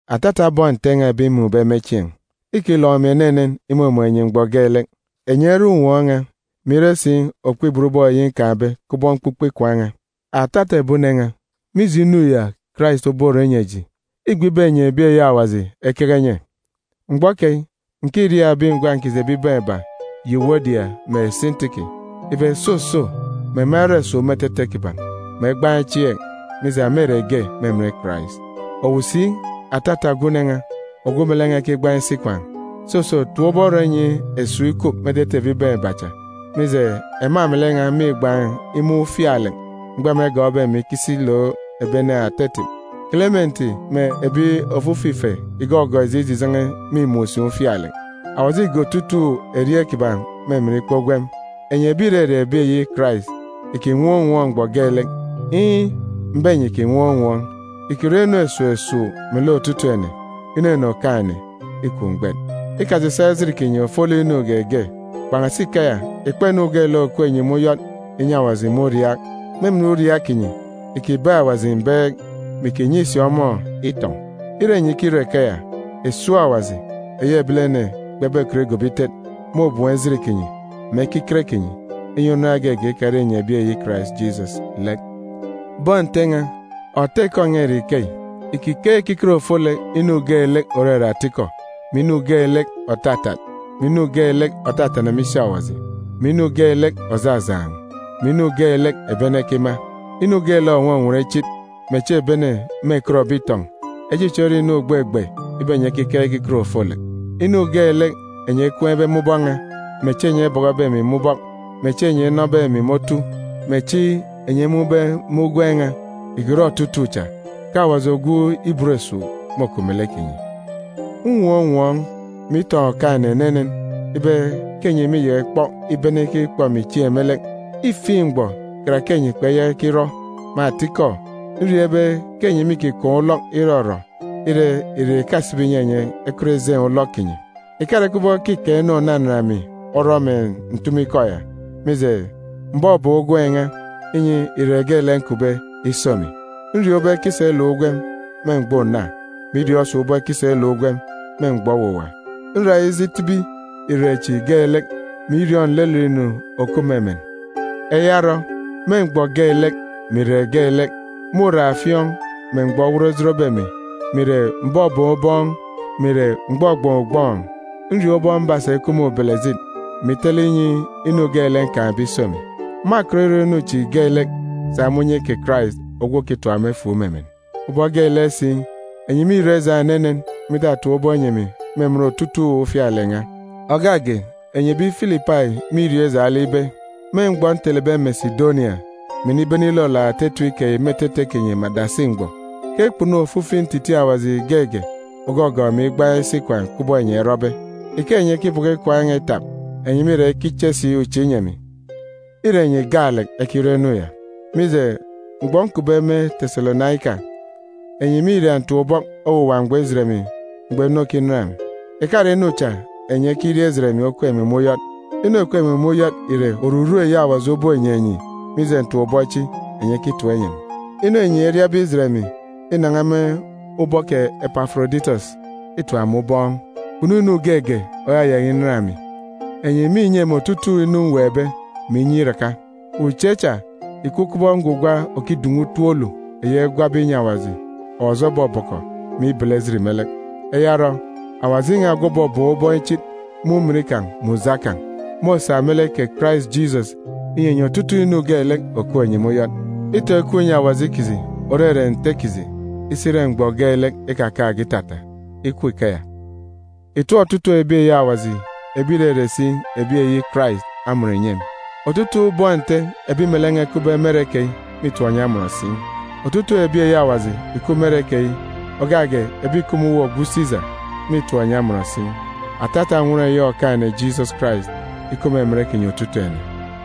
Atata bọn Nte n̄a ebi mmun̄be me chieen̄, îkilọk emi enenen imumun̄ enyi mgbọ geelek. Enyi ere unwọọn̄ n̄a, mè ire si okpibot ubọọn̄ eyi nkaan̄be kubọk mkpukpe ikwaan̄ n̄a. Atata ebi une n̄a, mije inu ya Karais oborọ inyi eji, îgbe ibe enyi ebi eyi Awaji ekeke enye. Mgbọ keyi, ǹkiriaak ebi ngwan̄ kiji ebibaan̄ iba, Yuwodia mè Sintiki, ibe soso, mè ema erọ esuuk me etete kiban̄, mè egbaan̄ echieek, mije, ema ìre ge me emen Karais. Owu si, atata ogwu une n̄a, ogwu melek n̄a ekigbaan̄ isi ikwaan̄, soso, tap ubọk rọ inyi esuuk ikup me etete ebibaan̄ iba cha, mije, ema melek n̄a mîgbaan̄ imun̄ ufialek mgbọ ema egọọkbe emi ikisi ilook ebi ene ata etip. Kelementi mè ebi ofifi ife ìgọgọọk eji ijijen̄e mîmun̄ si ufialek. Awaji îge otutuuk erieen̄ kiban̄ me emen ikpa ugwem. Enyi ebi ìrere ebi eyi Karais, ìkinwọọn̄ unwọọn̄ mgbọ geelek! Iin̄, m̀be enyi ìkinwọọn̄ unwọọn̄! Ìkirọ inu esuuk esuuk melek otutuuk ene. Inunu Okaan̄-ene îkup mgbet. Ikasisaak ejit kinyi ofolek inu geege. Kpan̄asi ikeya, ìkpa inu geelek òkup enyi me uyọt ìnyi Awaji me uriaak. Me emen uriaak kinyi, ìkibeek Awaji mbeek, mè ìkinyi si ọmọ itọn̄. Ire enyi ikirọ ikeya, esuuk Awaji, eyi ebilene kpebekọt igobo itet, môbem ejit kinyi mè ekiket kinyi, inyi unan geege ikare enyi ebi eyi Karais Jisọs lek. Bọn Nte n̄a, òta ikọ n̄a ìre ikeyi: Ìkikeek ekiket ofolek inu geelek òrere atikọ, mè inu geelek òtatat, mè inu geelek òtatana me isi Awaji, mè inu geelek òjajaan̄, mè inu geelek ebi ene ekima. Inu geelek ònwọnwọn ichit, mè echi ebi ene mêkọtbe itọn̄, echichi ore inu ògbegbe ibe enyi ekekeek ekiket ofolek. Inu geelek enyi ekween̄be me ubọk n̄a, mè echi enyi ebọkọbe emi me ubọk, mè echi enyi enọbe emi me otu, mè echi enyi emun̄be me ugwem n̄a, ìkirọ otutuuk cha, ke Awaji ogwu ibot esuuk môkup melek kinyi. Nnwọọn̄ unwọọn̄, mè itọn̄ Okaan̄-ene enenen ibe ke enyi mîyaka ikpọk ibene ikikpọ emi chieen̄ me lek. Îfiin̄ mgbọ, karake enyi kpeyaka ikirọ. Me atikọ, nriọọn̄ ibe ke enyi mîkikaan̄ ulọk irọrọ, ire, irek ìkasibi ìnyi enyi ekọt ejeen̄ ulọk kinyi. Ìkare kubọk ke îkaan̄ inu ònanan emi orọ mè ǹtumu ikọ ya, mije, m̀bọbọọk ugwem n̄a, inyi irek geelek nkupbe iso emi. Nriọọn̄ ubọk ekisa iluk ugwem me mgbọ una, mè iriọọn̄ si ubọk ekisa iluk ugwem me mgbọ owuwa. Nra ije itibi irek chi geelek, mè iriọọn̄ nlelet inu òkup me emen. Eya orọ, me mgbọ geelek, mè irek geelek, me uraafiọọn̄, mè mgbọ owot ojotbe emi, mè ìre m̀bọbọọn̄ ubọọn̄, mè ìre m̀gbọgbọọn̄ ugbọọn̄, nriọọn̄ ubọk mbasa ikup me ubelejit, mè itele inyi inu geelek nkaan̄be iso emi. Mâkọt irọ inu geelek sa me unye kè Karais ogwu òkitap emi efuuk me emen. Ubọk geelek si, enyi mîrọ ijaan̄ enenen me itatap ubọk inyi emi me emen otutuuk ufialek n̄a. Ògak ge, enyi ebi Filipai mîriọọn̄ ijaan̄ lek ibe, me mgbọ ntelebe Mesidonia, mè inibene ilolook ata etip keyi me etete kinyi me adasi mgbọ, ke kpunu ofifi ntitiin̄ Awaji geege ògọgọọk emi igbaan̄ isi ikwaan̄ kubọk enyi erọbe. Ike enyi ekibọkọ ikwaan̄ n̄a itap, enyi mîra ikiche si uche inyi emi. Îre enyi gaalek ekirọ inu ya. Mije, mgbọ nkupbe me Teselonaika, enyi mîria ntap-ubọk owuwa mgbọ ijet emi mgbọ inu okinan emi. Ìkare inu cha enyi ekiria ijet emi okup emi me uyọt. Inu òkup emi me uyọt ìre oruru eyi Awaji obonyi enyi mije ntap-ubọk chi enyi ekitap inyi emi. Inu enyi eriabe ijet emi inan̄a me ubọk kè Epaforoditọs îtap emi ubọọn̄. Kpunu inu geege òyayaka inan emi. Enyi mînyi emi otutuuk inu mweekbe, mè inyi iraka. Uche cha ìkup kubọk ngwugwa òkidun̄u utop olu, eyi egwabe inyi Awaji, Awaji obọbọkọ, mè ibele ejit me lek. Eya orọ, Awaji n̄a ogwu òbọbọọn̄ ubọọn̄ ichit me ujamgbugbo kan̄, môsa me lek kè Karais Jisọs inyi enyi otutuuk inu geelek òkup enyi me uyọt. Itọn̄ ikup inyi Awaji kiji, òrere Nte kiji, isi ire mgbọ geelek ikakaan̄ge itata. Ikup ikeya. Ìtọp otutuuk ebi eyi Awaji, ìrere si ebi eyi Karais amọn ìnyi emi. Otutuuk bọn Nte ebi melek n̄a ekupbe me ere keyi mîtọp enyi amọn si. Otutuuk ebi eyi Awaji ìkup me ere keyi, ògak ge ebi ìkup me uwu ogwu Sisa, mîtọp enyi amọn si. Atata nnwọn eyi Okaan̄-ene Jisọs Karais ikup me emen kinyi otutuuk ene.